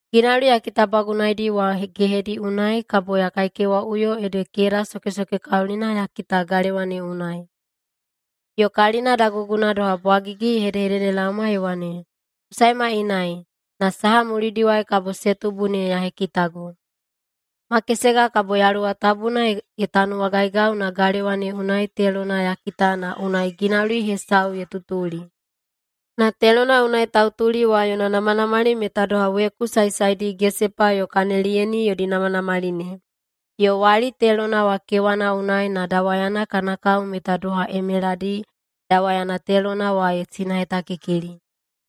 Ginauli ya kitabagubagunaidi wa gehedi wa unai kabo ya kaikewaꞌuyo ede keda sokesokekaulina ya kita galewa ne unai. Yo kalina daguguna doha bwagigi ye hedehededelaoma ye wane, “Ku saema inai, na saha mulidiwai kabo se tubu ne ya hekitago.” Makesega kabo Yaluwa Tabuna ye tanuwagaigau na galewa ne unai telona ya kita na unai ginauli hesau ye tutuli. Na telona unai tautuli wa yona namanamali meta doha weku saesaedi gesepa yo kaneliyeni yodi namanamali ne. Yo wali telona wa kewana unai na dawayana kana kao meta doha emeladi dawayana telona wa ye sinahetakikili.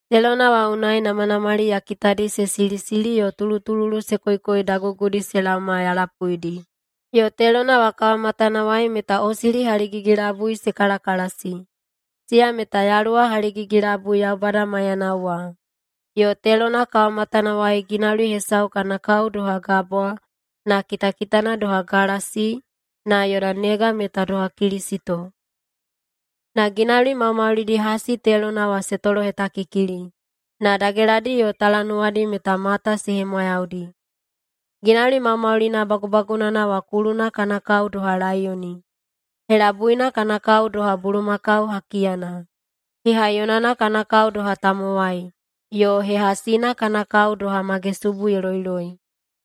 Telona wa unai namanamali ya kitadi se silisili yo tulutululu se koikoi dagugudi se laoma ya lapuidi. Yo telona wa kawamatanawai meta osili haligigi-labui se kalakalasi. Siya meta yaluwa haligigi-labui Yaubada maiyanao wa. Yo telona kawamatanawai ginauli hesau kana kao doha gabwa na kitakitana doha galasi na yona nega meta doha kilisito. Na ginauli maumaulidi hasi telona wa se tolohetakikili, na dageladi yo talanuwadi meta mata se hemwayaudi. Ginauli maumaulina bagubagunana wa kuluna kana kao doha laiyoni, helabuina kana kao doha bulumakau hakiyana, hehaiyonana kana kao doha tamowai, yo hehasina kana kao doha magesubu ye loiloi.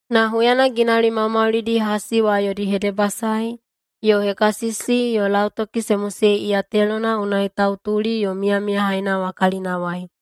Na huyana ginauli maumaulidi hasi wa yodi hedebasae yo hekasisi yo lautoki se mosei iya telona unai tautuli yo miyamiyahaina wa kalinawai,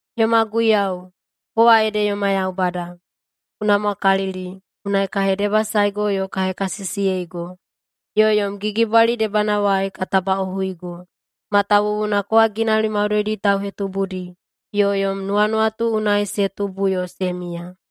“Yoma Guiyau, kowa ede yoma Yaubada. Ku namwakalili, unai ka hedebasaego yo ka hekasisiyego, yo yom gigibwali debanawai ka tabaꞌohuigo. Matawuwuna kowa ginauli maudoidi tauhetubudi yo yom nuwanuwatu unai se tubu yo se miya.”